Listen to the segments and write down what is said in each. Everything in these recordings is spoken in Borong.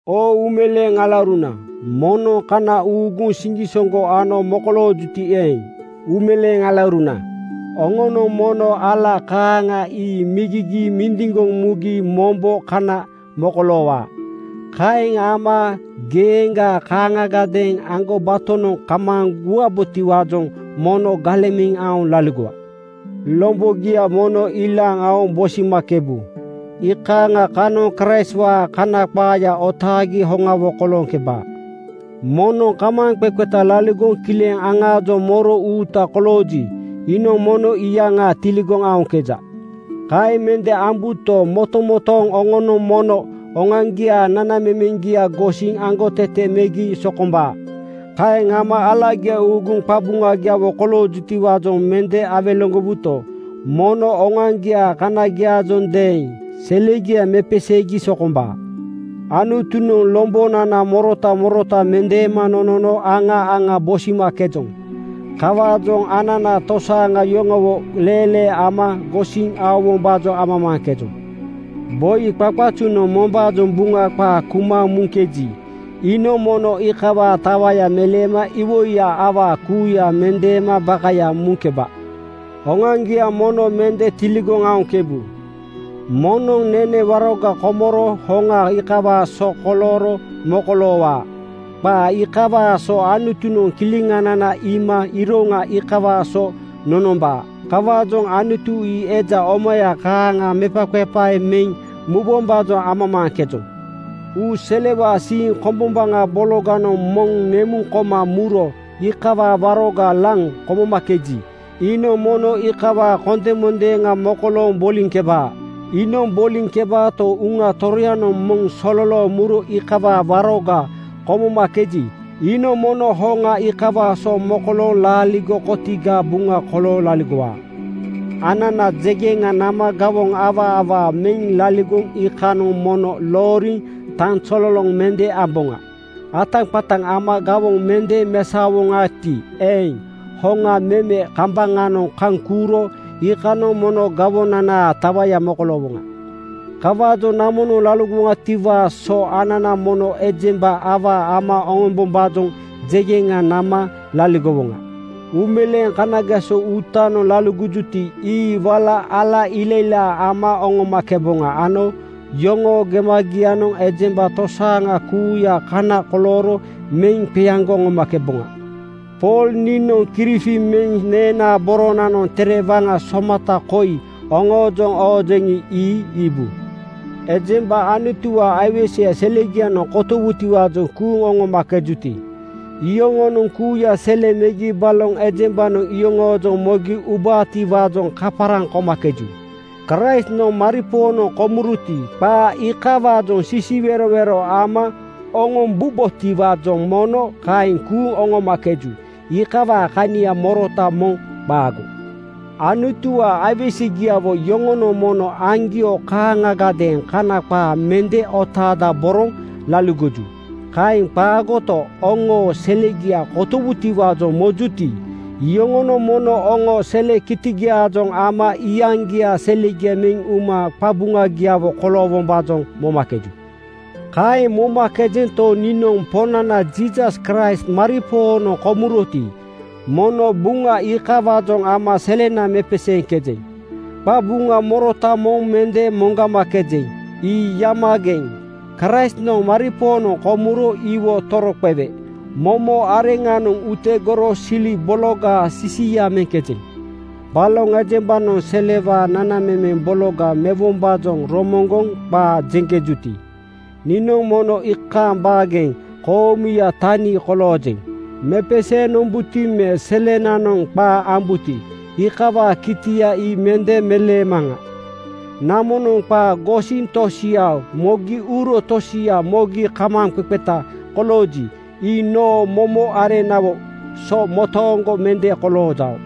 Oo uumeleeŋ alauruna, moŋnoŋ kana uuguŋ siŋgisoŋgo ano mokoloojuti eeŋ, uumeleeŋ alauruna oŋonoŋ mono ala kaaŋa ii migigiiŋ mindiŋgoŋ mugi mombo kana mokoloowaa. Kaeŋ ama geeŋga kaaŋagadeeŋ aŋgobatonoŋ kamaaŋ guwabotiwaajoŋ mono galeŋ meŋ aoŋ laligowa. Lombogia mono ilaaŋ aoŋ bosimakebu. Iikaaŋa kanoŋ Kraistwaa Kana qaaya otaagi hoŋawo kolooŋkebaa. Moŋnoŋ kamaaŋqeqeta laligoŋ kileŋ aŋaajoŋ moro uuta kolooji, iinoŋ mono iyaŋa tiligoŋ aoŋkeja. Kaeŋ mende ambuto, motomotooŋ oŋonoŋ mono oŋoaŋgiaa nanamemeŋgia gosiŋ aŋgotete megi sokombaa. Kaeŋ ama alagia uuguŋ qabuŋagiawo koloojutiwaajoŋ mende awelegowuto, mono oŋoaŋgiaa kanagiaajondeeŋ selegia mepeseegi sokombaa. Anutunoŋ lombonana morota morota mendeema nonono aŋa aŋa bosimakejoŋ. Kawaajoŋ anana tosaaŋa yoŋowo leelee ama gosiŋ aowombaajoŋ amamaaŋkejoŋ. Boi qaqazunoŋ mombaajoŋ Buŋa qaa kuma muŋkeji, iinoŋ mono iikawaa tawaya meleema iwoiya awaa kuuya mendeema bakaya muŋkeba. Oŋoaŋgia mono mende tiligoŋ aoŋkebu. Moŋnoŋ nene waroga komoro hoŋa iikawaa so kolooro mokoloowaa. Qaa iikawaa so Anutunoŋ kileŋanana iima iroŋa iikawaa so nonombaa. Kawaajoŋ Anutu ii eja omaya kaaŋa mepaqepae meŋ mubombaajoŋ amamaaŋkejoŋ. Uu selewaa siiŋ kombombaŋa bologanoŋ moŋ nemuŋ koma muro iikawaa waroga laŋ komomakeji, iinoŋ mono iikawaa kondemondeeŋa mokolooŋ boliŋkebaa. Iinoŋ boliŋkebaato, Uŋa Toroyanoŋ moŋ sololooŋ muro iikawaa waroga komomakeji, iinoŋ mono hoŋa iikawaa so mokolooŋ laaligo kotigaa buŋa kolooŋ laligowaa. Anana jegeŋa nama gawoŋ awaa awaa meŋ laligoŋ iikanoŋ mono looriŋ tanzololoŋ mende amboŋa. Ataqataŋ ama gawoŋ mende mesaowoŋati eeŋ, hoŋa meme kambaŋanoŋ kaŋ kuuro iikanoŋ mono gawonanaa tawaya mokoloowoŋa. Kawaajoŋ namonoŋ laligowoŋatiwaa so anana mono ejemba awaa ama oŋombombaajoŋ jegeŋa nama laligowoŋa. Uumeleeŋ kanageso uutanoŋ laligojuti, ii wala ala ilailaa ama oŋomakeboŋa ano yoŋoo gemagianoŋ ejemba tosaaŋa kuuya kana kolooro meŋ qeaŋgoŋ oŋomakeboŋa. Pool niinoŋ kirifi meŋ neenaa boronanoŋ tere waŋa somata koi oŋoojoŋ oojeŋi, ii iibu. Ejemba Anutuwaa aiweseya selegianoŋ kotowutiwaajoŋ kuuŋ oŋomakejuti, iyoŋonoŋ kuuya sele megi baloŋ ejembanoŋ yoŋoojoŋ mogi ubaatiwaajoŋ kaparaŋ komakeju. Kraistnoŋ maripoonoŋ komuroti, qaa iikawaajoŋ sisiwerowero ama oŋombubotiwaajoŋ mono kaeŋ kuuŋ oŋomakeju. Iikawaa kania morota moŋ qaago. Anutuwaa aiwesegiawo yoŋonoŋ mono aŋgio kaaŋagadeeŋ Kana qaa mende otaadaboroŋ laligoju. Kaeŋ qaagoto, oŋoo selegia kotowutiwaajoŋ mojuti, iyoŋonoŋ mono oŋoo sele kitigiaajoŋ ama iyaŋgiaa selegia meŋ uma qabuŋagiawo koloowombaajoŋ momakeju. Kaeŋ momakejuto, niinoŋ Poŋnana Jiisas Kraist maripoonoŋ komuroti, mono Buŋa iikawaajoŋ ama selena mepeseeŋkejeŋ. Qabuŋa morota moŋ mende moŋgamakejeŋ. Ii yamageŋ (kozigeŋ)! Kraistnoŋ maripoonoŋ komuro iwo toroqewe momo areŋnanoŋ utegoro sili bologaa sisia meŋkejeŋ. Baloŋ ejembanoŋ selewaa nanamemeŋ bologa mewombaajoŋ romoŋgoŋ qaa jeŋkejuti, niinoŋ mono iikaaŋ baageŋ koomuya tani koloojeŋ. Mepeseeŋ nombuti me selenanoŋ qaa ambuti, iikawaa kitia ii mende meleemaŋa. Namonoŋ qaa gosiŋ tosia mogi uro tosia mogi kamaaŋqeqeta kolooji, ii noo momo areŋnawo so motooŋgo mende koloojao.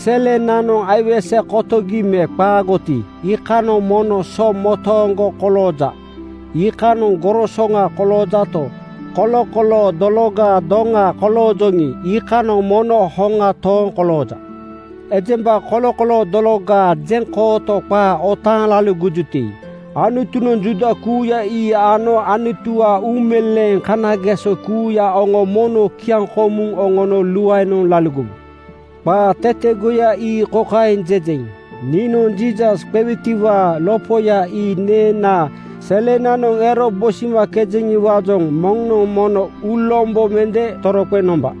Selenananoŋ aiwese kotogi me qaagoti, iikanoŋ mono so motooŋgo kolooja. Iikanoŋ gorosoŋa koloojato, kolokoloo dologaa doŋa koloojoŋi, iikanoŋ mono hoŋa tooŋ kolooja. Ejemba kolokoloo dologaa jeŋkooto qaa otaaŋ laligojuti, Anutunoŋ Juuda kuuya ii ano Anutuwaa uumeleeŋ kanageso kuuya oŋo mono kiaŋkomuŋ oŋono luaenoŋ laligowu. Qaa tetegoya ii kokaeŋ jejeŋ: Niinoŋ Jiisas qegitiwaa lopoya ii neenaa selenanoŋ ero bosimakejeŋiwaajoŋ moŋnoŋ mono uulombo mende toroqeŋ nomba.